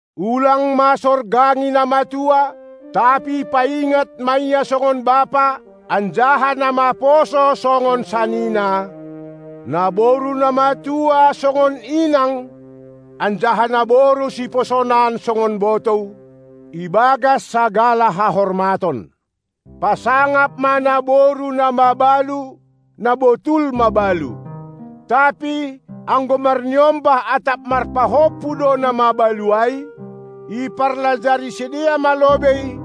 Ulang ma sorgangi na matua, tapi paingat ma ia songon bapa, anjaha na maposo songon sanina, naboru na matua songon inang anjaha naboru siposonan songon botou, ibagas sagala hahormaton. Pasangap ma naboru na mabalu, na botul mabalu. Tapi, anggo marniombah atap marpahompu do na mabalu ai, iparlajari sidea ma lobei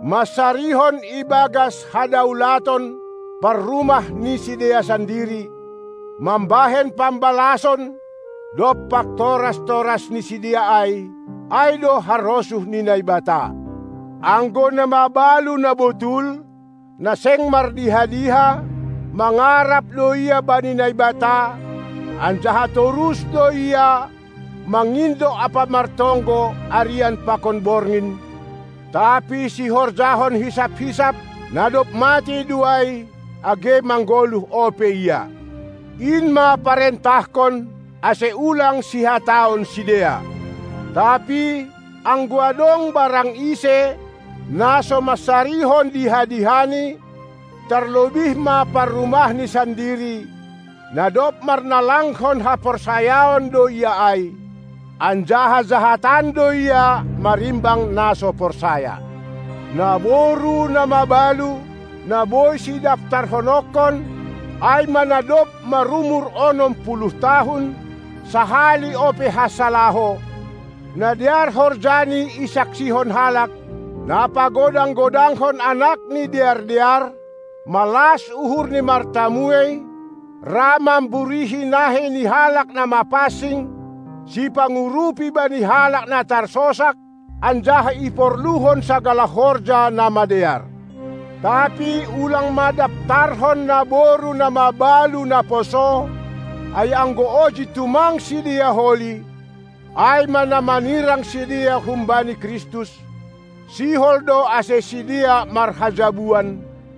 mansarihon ibagas hadaulaton parrumah ni sidea sandiri, mambahen pambalason dompak toras-toras ni sidea ai, ai do harosuh ni Naibata. Anggo na mabalu na botul, na seng mardiha-diha, mangarap do ia bani Naibata, anjaha torus do ia, mangindo ampa martonggo arian pakon borngin; tapi sihorjahon hisap-hisap, na dob matei do ai, age manggoluh ope ia. In ma parentahkon, ase ulang sihataon sidea. Tapi, anggo adong barang ise, na so mansarihon diha-dihani, tarlobih ma parrumahni sandiri, na dob marnalangkon haporsayaon do ia ai, anjaha jahatan do ia marimbang na so porsaya. Naboru na mabalu, na boi sidaftarhononkon, ai ma na dob marumur onom puluh tahun, sahali ope hansa laho, na dear horjani isaksihon halak, na pagodang-godangkon anakni dear-dear, malas uhurni martamuei, ra mamburihi nahei ni halak na mapansing, sipangurupi bani halak na tarsosak, anjaha iporluhon sagala horja na madear. Tapi ulang ma daftarhon naboru na mabalu na poso, ai anggo oji tumang sidea holi, ai ma na manirang sidea humbani Kristus, sihol do ase sidea marhajabuan,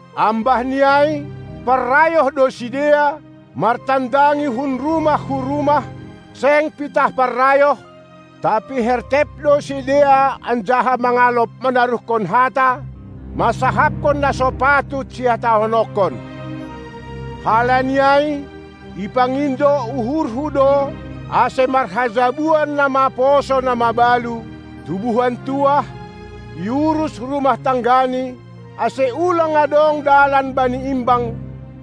Ambah ni ai, parrayoh do sidea, martandangi hun rumah hu rumah; seng pitah parrayoh, tapi hertep do sidea anjaha mangalop manaruhkon hata, mansahapkon na so patut sihatahononkon. Halani ai, ipangindo uhurhu do ase marhajabuan na maposo na mabalu, tubuhan tuah, iurus rumah tanggani, ase ulang adong dalan bani imbang,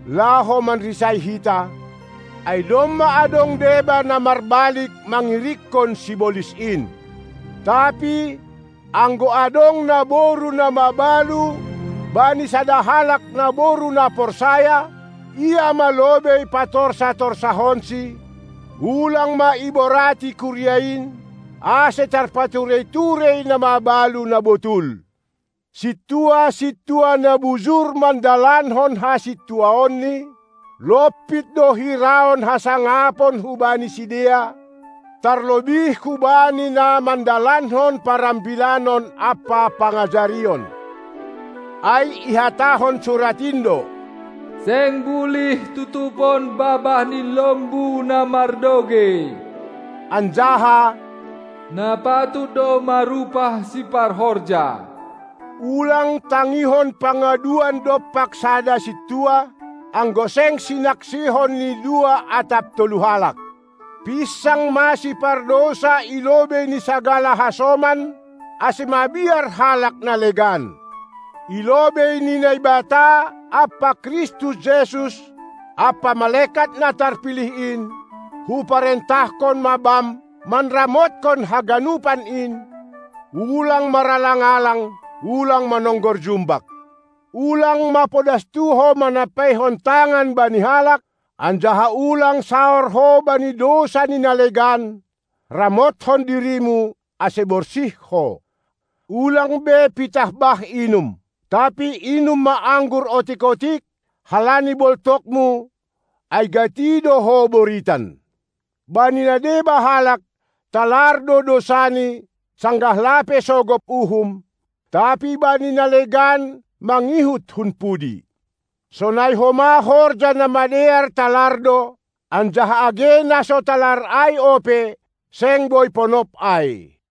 laho manrisai hita, ai domma adong deba na marbalik mangirikkon sibolis in. Tapi anggo adong naboru na mabalu bani sada halak naboru na porsaya, ia ma lobei patorsa-torsahonsi; ulang ma iborati kuria in, ase tarpaturei-turei na mabalu na botul. Sintua-sintua na bujur mandalankon hasintuaonni, lompit do hiraon hasangapon hubani sidea, tarlobih hubani na mandalankon parambilanon ampa pangajarion. Ai ihatahon surat in do: "Seng bulih tutupon babah ni lombu na mardogei," anjaha: "Na patut do marupah siparhorja". Ulang tangihon pangaduan dompak sada sintua, anggo seng sinaksihon ni dua atap tolu halak. Pinsang ma sipardousa i lobei ni sagala hasoman, ase mabiar halak na legan. I lobei ni Naibata, ampa Kristus Jesus, ampa malekat na tarpilih in, hu parentahkon ma bam manramotkon haganupan in, ulang maralang-alang, ulang manonggor jumbak. Ulang mapodastu ho manampeihon tangan bani halak, anjaha ulang saor ho bani dousa ni na legan; ramothon dirimu, ase borsih ho. Ulang be pitah bah inum, tapi inum ma anggur otik-otik, halani boltokmu, ai gati do ho boritan. Bani na deba halak, talar do dousani, sanggah lape sogop uhum; tapi bani na legan mangihut hun pudi. Sonai homa horja na madear talar do, anjaha age na so talar ai ope, seng boi ponop ai.